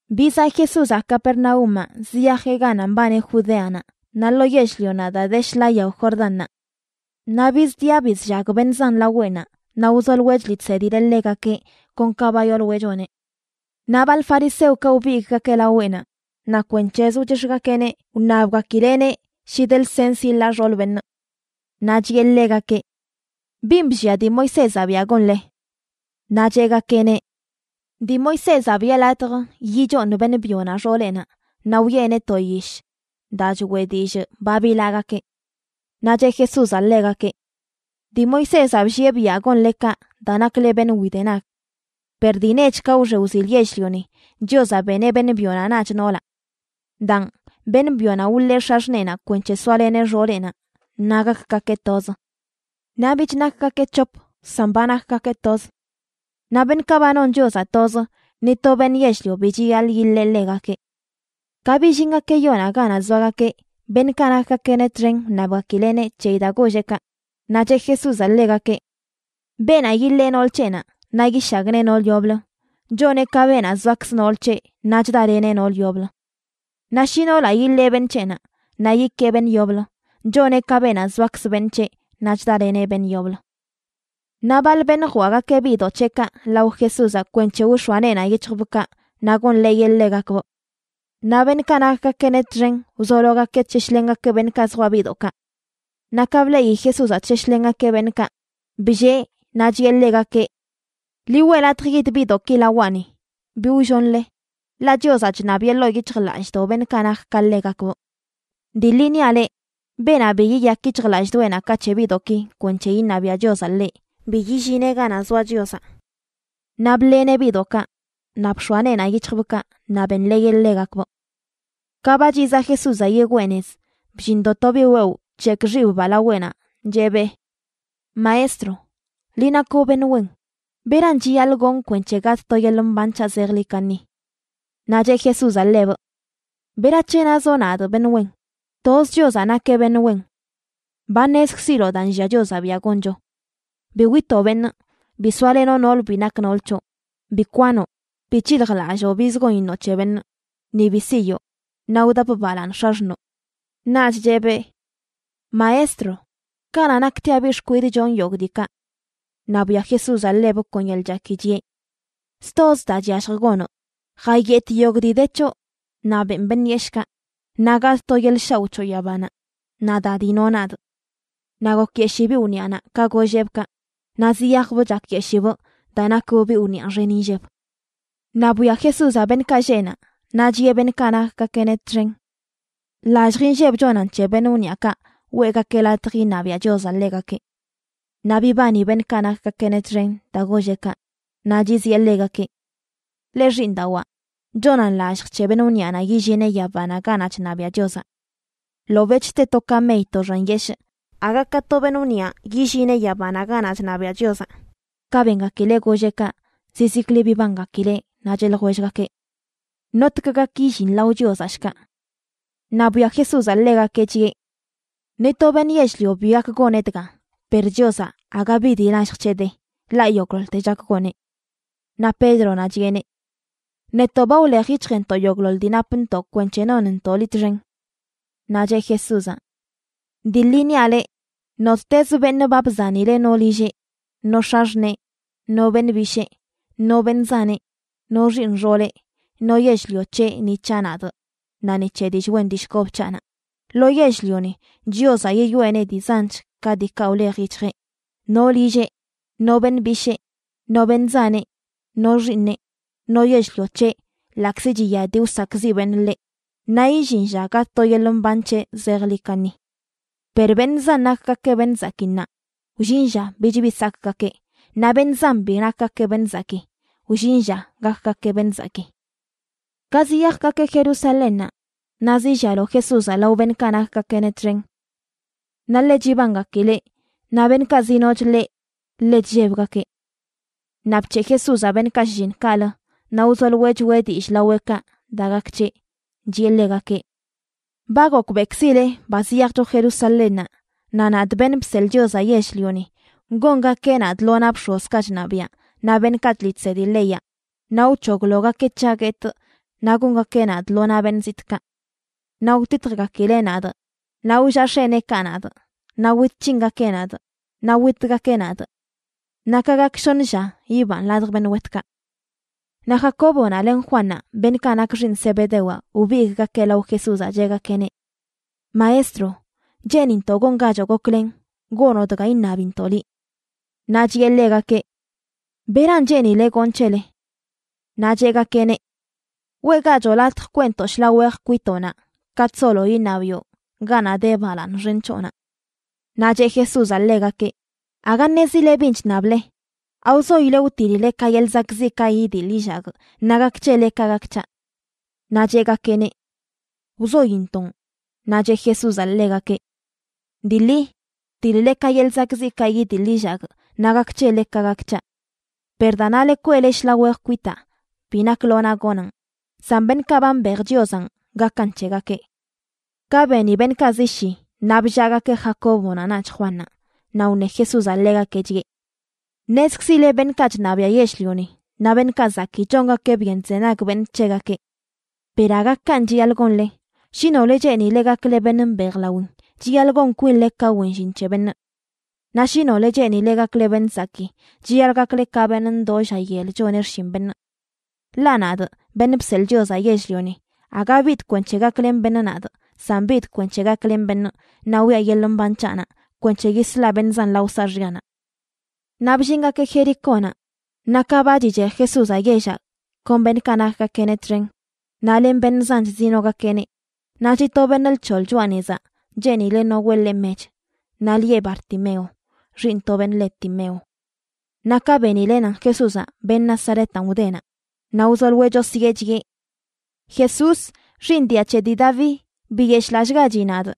Bizaꞌ Jesúzaꞌ Capernaúmaꞌ ziyajeꞌ ganaꞌ mbani Judeanaꞌ naꞌ lo yell-lionaꞌ daa de shḻaa yao Jordánnaꞌ. Naꞌ bizdiꞌa bizllag beṉꞌ zan laweꞌnaꞌ naꞌ wzoloeꞌ chliꞌ chsedileꞌ ḻegakeꞌ kon ka ba yooloeꞌ choneꞌ. Naꞌ baḻ fariseokaꞌ wbigꞌgakeꞌ laweꞌnaꞌ, naꞌ kwenc̱hezə wchix̱gakeꞌneꞌ wṉabgakileꞌneꞌ shi de lsens yiḻaa xool beṉꞌ. Naꞌ chiꞌe ḻegakeꞌ: ―¿Bin bllia dii Moisézaꞌ biaꞌ gonle? Naꞌ cheꞌgakeꞌneꞌ: ―Dii Moisézaꞌ biꞌe latj yichooṉ beṉꞌ byonaꞌ xooleꞌnaꞌ naꞌ wiꞌeneꞌ to yish daa choꞌe dillꞌ ba bilaagakeꞌ. Naꞌ cheꞌ Jesúzaꞌ ḻegakeꞌ: ―Dii Moisézaꞌ bllieꞌ biaꞌ gonle kaꞌ daa nakle beṉꞌ widenag. Per dii nech ka wxe wzil yell-lioni, Chiozaꞌ “beneꞌ beṉꞌ byonaꞌ naꞌch noolaꞌ.” “Daan, beṉꞌ byonaꞌ wḻee x̱axṉeenaꞌ kwenc̱he soaleneꞌ xooleꞌnaꞌ naꞌ gakgakeꞌ toz.” Naꞌ bich nakgakeꞌ c̱hop, san ba nakgakeꞌ toz. Naꞌ beṉꞌkaꞌ ba non Chiozaꞌ toz, ni to beṉꞌ yell-lio bi chiyaḻꞌ yiḻee ḻegakeꞌ. Ka billingakeꞌ yoonaꞌ ganaꞌ zoagakeꞌ, beṉꞌkaꞌ nakgakeꞌneꞌ txen wṉabgakileꞌneꞌ c̱heyi daa golleꞌ kaꞌ. Naꞌ cheꞌ Jesúzaꞌ ḻegakeꞌ: ―Beenaꞌ yiḻee nool c̱heꞌnaꞌ naꞌ yishagnee nool yoblə, choneꞌ ka beenaꞌ zoakzə nool c̱heꞌ naꞌ chdaleneꞌ nool yoblə. Naꞌ shi noolaꞌ yiḻee beṉꞌ c̱heꞌnaꞌ naꞌ yikee beṉꞌ yoblə, choneꞌ ka beenaꞌ zoakzə beṉꞌ c̱heꞌ naꞌ chdaleneꞌ beṉꞌ yoblə. Naꞌ baḻ beṉꞌ jwaꞌgakeꞌ biꞌdoꞌ c̱heꞌkaꞌ lao Jesúzaꞌ kwenc̱he wx̱oa neenaꞌ yic̱hjbꞌkaꞌ naꞌ gonḻeeyeꞌ ḻegakbꞌ. Naꞌ beṉꞌkaꞌ nakgakeꞌneꞌ txen wzologakeꞌ chsheshlengakeꞌ beṉꞌkaꞌ zjwaꞌ biꞌdoꞌkaꞌ. Naꞌ ka bleꞌi Jesúzaꞌ chsheshlengakeꞌ beṉꞌkaꞌ, bllee naꞌ chiꞌe ḻegakeꞌ: ―Ḻi weꞌ latj yid biꞌdoꞌki lawaꞌni, bi wllonle, ḻaꞌ Chiozaꞌ chṉabiꞌe ḻoo yic̱hjlallꞌdoꞌ beṉꞌkaꞌ nak ka ḻegakbꞌ. Dii ḻi niaꞌ leꞌ, beenaꞌ bi yiyak yic̱hjlallꞌdoꞌenaꞌ ka c̱he biꞌdoꞌki kwenc̱he iṉabiaꞌ Chiozaꞌ ḻeꞌ, bi yillineꞌ ganaꞌ zoa Chiozaꞌ. Naꞌ bḻeneꞌ biꞌdoꞌkaꞌ, naꞌ bx̱oa neenaꞌ yic̱hjbꞌkaꞌ naꞌ benḻeeyeꞌ ḻegakbꞌ. Ka ba chizaꞌ Jesúzaꞌ yigwee nez, bllindo to biꞌ wewꞌ bc̱hekꞌ xibbaa laweꞌnaꞌ cheꞌbee: ―Maestro, liꞌ nakoꞌ beṉꞌ wen. ¿Beran chiyaḻꞌ gonꞌ kwenc̱he gatꞌ to yeḻꞌ mban c̱haꞌ zejḻi kaṉi? Naꞌ cheꞌ Jesúzaꞌ ḻebꞌ: ―¿Berac̱he nazoꞌ nadꞌ beṉꞌ wen? Toz Chiozaꞌ nakeꞌ beṉꞌ wen. Ba ṉezkziloꞌ daa nllia Chiozaꞌ biaꞌ goncho: “Bi witoꞌ beṉꞌ, bi soalenoꞌ nool bi nak nool c̱hoꞌ, bi kwanoꞌ, bi c̱hiljlalloo bizə gon iṉoꞌ c̱he beṉꞌ, ni bi siyoo, naꞌ wdap balaaṉ x̱axṉoo.” Naꞌch cheꞌbee: ―Maestro, kanaꞌ naktiaꞌ biꞌ xkwidꞌ chonꞌ yogꞌ diikaꞌ. Naꞌ bwia Jesúzaꞌ ḻebꞌ kon yeḻꞌ chaki, chiꞌe: ―Stozə daa chyallj gonoꞌ: jayetꞌ yogꞌ dii de c̱hoꞌ naꞌ beꞌn beṉꞌ yeshꞌkaꞌ, naꞌ gatꞌ to yeḻꞌ shaoꞌ c̱hoꞌ yabanaꞌ. Naꞌ da dinoꞌ nadꞌ. Naꞌ gokyeshii biꞌ wniꞌanaꞌ ka golleꞌbꞌ kaꞌ. Naꞌ ziyajbꞌ chakyeshibꞌ daa nakbꞌ biꞌ wniꞌa xen inlleb. Naꞌ bwia Jesúzaꞌ beṉꞌkaꞌ lleꞌ naꞌ, naꞌ chiꞌe beṉꞌkaꞌ nakgakeꞌneꞌ txen: ―¡Lallj inlleb chonan c̱he beṉꞌ wniꞌakaꞌ weꞌgakeꞌ latj iṉabiaꞌ Chiozaꞌ ḻegakeꞌ! Naꞌ bibani beṉꞌkaꞌ nakgakeꞌneꞌ txen daa golleꞌ kaꞌ. Naꞌ chiziꞌe ḻegakeꞌ: ―Leꞌ xiiṉdawaa, chonan lallj c̱he beṉꞌ wniꞌanaꞌ yillineꞌ yabanaꞌ ganaꞌ chṉabiaꞌ Chiozaꞌ. Ḻobeꞌch te to kamey to xan yeshꞌ aga ka to beṉꞌ wniꞌa yillineꞌ yabanaꞌ ganaꞌ chṉabiaꞌ Chiozaꞌ. Ka bengakileꞌ golleꞌ kaꞌ, zizikli bibangakileꞌ, naꞌ cheꞌ ljwellgakeꞌ: ―¿Notg gak yillin lao Chiozaꞌ, shkaꞌ? Naꞌ bwia Jesúzaꞌ ḻegakeꞌ chiꞌe: ―Ni to beṉꞌ yell-lio bi gak goneꞌ dga, per Chiozaꞌ aga bi dii lallj c̱heꞌ de, ḻaꞌ yogꞌḻoḻte chak goneꞌ. Naꞌ Pédronaꞌ chiꞌeneꞌ: ―Netoꞌ ba wlej yic̱hjntoꞌ yogꞌḻoḻ dii napntoꞌ kwenc̱he nonntoꞌ liꞌ txen. Naꞌ cheꞌ Jesúzaꞌ: ―Dii ḻi niaꞌ leꞌ, nottezə beṉꞌ ba bzanileꞌ no lilleꞌ, no x̱axṉee, no beṉꞌ bishee, no beṉꞌ zaneꞌ, no xiiṉ xooleꞌ, no yell-lio c̱heꞌ ni c̱haꞌ nadꞌ naꞌ ni c̱he dillꞌ wen dillꞌ kob c̱haꞌnaꞌ, lo yell-lioni Chiozaꞌ yiyoꞌeneꞌ dii zanch ka diikaꞌ wlej yic̱hjeꞌ, no lilleꞌ, no beṉꞌ bishee, no beṉꞌ zaneꞌ, no xiiṉeꞌ, no yell-lio c̱heꞌ ḻaꞌkzi chiya dii wsakꞌziꞌ beṉꞌ ḻeꞌ, naꞌ illin lla gatꞌ to yeḻꞌ mban c̱heꞌ zejḻi kaṉi. Per beṉꞌ zan nakgakeꞌ beṉꞌ zakii ṉaa, wllin lla bich bi sakꞌgakeꞌ, naꞌ beṉꞌ zan bi nakgakeꞌ beṉꞌ zakii, wllin lla gakgakeꞌ beṉꞌ zakii. Ka ziyajgakeꞌ Jerusalénnaꞌ, naꞌ zillialo Jesúzaꞌ lao beṉꞌkaꞌ nakgakeꞌneꞌ txen. Naꞌ ḻe chibangakileꞌ, naꞌ beṉꞌkaꞌ zinoch ḻeꞌ ḻe chllebgakeꞌ. Naꞌ bc̱heꞌ Jesúzaꞌ beṉꞌkaꞌ shlliṉ kaꞌlə naꞌ wzoloeꞌ choꞌe dillꞌ laweꞌkaꞌ daa gak c̱heꞌ, chiꞌe ḻegakeꞌ: ―Ba gokbeꞌkzileꞌ ba ziyajcho Jerusalénnaꞌ, naꞌ nadꞌ, Beṉꞌ Bseḻꞌ Chiozaꞌ Yell-lioni, gongakeꞌ nadꞌ lo naꞌ bx̱ozkaꞌ chṉabiaꞌ naꞌ beṉꞌkaꞌ chliꞌ chsedi leyaꞌ, naꞌ wc̱hoglogakeꞌ c̱haꞌ guetꞌ naꞌ gongakeꞌ nadꞌ lo naꞌ beṉꞌ zitꞌkaꞌ. Naꞌ wtitjgakileꞌ nadꞌ, naꞌ wllaꞌ x̱eneekaꞌ nadꞌ, naꞌ wit c̱hingakeꞌ nadꞌ, naꞌ witgakeꞌ nadꞌ. Naꞌ ka gak shoṉ lla yibanꞌ ladj beṉꞌ wetkaꞌ. Naꞌ Jacóbonaꞌ len Juannaꞌ, beṉꞌkaꞌ nak xiiṉ Zebedewaꞌ, wbigꞌgakeꞌ lao Jesúzaꞌ cheꞌgakeꞌneꞌ: ―Maestro, cheenintoꞌ gongachoꞌ goklen gonoꞌ dga iṉabintoꞌ liꞌ. Naꞌ chiꞌe ḻegakeꞌ: ― ¿Beran cheenileꞌ gonꞌ c̱hele? Naꞌ cheꞌgakeꞌneꞌ: ―Weꞌgachoꞌ latj kweꞌntoꞌ shḻaa wej kwitoꞌnaꞌ katꞌ solo iṉabiꞌo ganaꞌ de balaaṉ xen c̱hoꞌnaꞌ. Naꞌ cheꞌ Jesúzaꞌ ḻegakeꞌ: ―Aga ṉezileꞌ bin chṉable. ¿Awzoileꞌ wtiḻ-le ka yeḻꞌ zakꞌziꞌkaꞌ idiḻ illagꞌ naꞌ gak c̱hele ka gak c̱haꞌ? Naꞌ cheꞌgakeꞌneꞌ: ―Wzointoꞌn. Naꞌ cheꞌ Jesúzaꞌ ḻegakeꞌ: ―Dii ḻi, wtiḻ-le ka yeḻꞌ zakꞌziꞌkaꞌ idiḻ illagꞌ naꞌ gak c̱hele ka gak c̱haꞌ. Per daa nale kweꞌle shḻaa wej kwitaa bi nak lo naꞌ gonaꞌn, san beṉꞌkaꞌ ba mbej Chiozanꞌ, gakan c̱hegakeꞌ. Ka beni beṉꞌkaꞌ zi shi, naꞌ bllaagakeꞌ Jacóbonaꞌ naꞌch Juannaꞌ. Naꞌ wṉe Jesúzaꞌ ḻegakeꞌ, chiꞌe: ―Ṉezkzile beṉꞌkaꞌ chṉabiaꞌ yell-lioni naꞌ beṉꞌkaꞌ zakii chongakeꞌ byen chzenag beṉꞌ c̱hegakeꞌ. Per aga kanꞌ chiyaḻꞌ gonle. Shi nole cheenile gakle beṉꞌ mbejlawin chiyaḻꞌ gon kwinle ka wen llin c̱he beṉꞌ. Naꞌ shi nole cheenile gakle beṉꞌ zakii, chiyaḻꞌ gakle ka beṉꞌ ndoo lla yel choneꞌ xshin beṉꞌ. Ḻaꞌ nadꞌ, Beṉꞌ Bseḻꞌ Chiozaꞌ Yell-lioni, aga bidꞌ kwenc̱he gaklen beṉꞌ nadꞌ, san bidꞌ kwenc̱he gaklenꞌ beṉꞌ naꞌ wiꞌa yeḻꞌ mban c̱haꞌnaꞌ kwenc̱he yislaꞌ beṉꞌ zan lao saaxyanaꞌ. Naꞌ bllingakeꞌ Jericónaꞌ, naꞌ ka ba chichej Jesúzaꞌ yellaꞌ kon beṉꞌkaꞌ nakgakeꞌneꞌ txen naꞌ len beṉꞌ zanch zinogakeꞌneꞌ, naꞌ chiꞌ to beṉꞌ lc̱hoḻ choꞌa nezaꞌ cheenileꞌ no weꞌ ḻeꞌ mech, naꞌ lieꞌ Bartimeo, xiiṉ to beṉꞌ le Timeo. Naꞌ ka benileꞌ nan Jesús, beṉꞌ Nazaretanꞌ, wdenaꞌ, naꞌ wzoloeꞌ chosyee, chiꞌe: ―¡Jesús, xiiṉ dia c̱he dii Daví, biyeshꞌlallꞌgachi nadꞌ!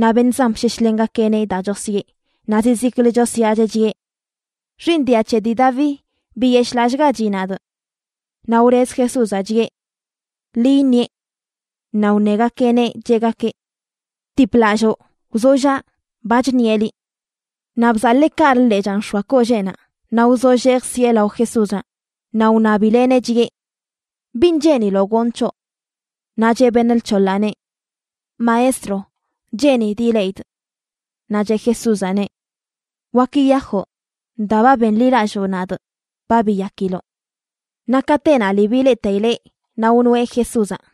Naꞌ beṉꞌ zan bsheshlengakeꞌneꞌ daa chosyee, naꞌ zizikli chosyaacheꞌ, chiꞌe: ―¡Xiiṉ dia c̱he dii Daví, biyeshꞌlallꞌgachi nadꞌ! Naꞌ wlez Jesúzaꞌ chiꞌe: ―Ḻi iṉieꞌ. Naꞌ wṉegakeꞌneꞌ, cheꞌgakeꞌ: ―Btiplalloo, wzollaꞌ, ba chṉieꞌ liꞌ. Naꞌ bzaḻee kaꞌlə lechaa nx̱oa kolleenaꞌ naꞌ wzollee jsieꞌ lao Jesúzaꞌ. Naꞌ wṉabileꞌneꞌ, chiꞌe: ―¿Bin cheeniloꞌ gonꞌ c̱hoꞌ? Naꞌ cheꞌ beṉꞌ lc̱hoḻaꞌneꞌ: ―Maestro, cheenidꞌ ileꞌidꞌ. Naꞌ cheꞌ Jesúzaꞌneꞌ: ―Wak yiyajoꞌ. Daa ba benḻilalloo nadꞌ, ba biyakiloꞌ. Naꞌ katenaꞌ lii bleꞌteileꞌ naꞌ wnoeꞌ Jesúzaꞌ.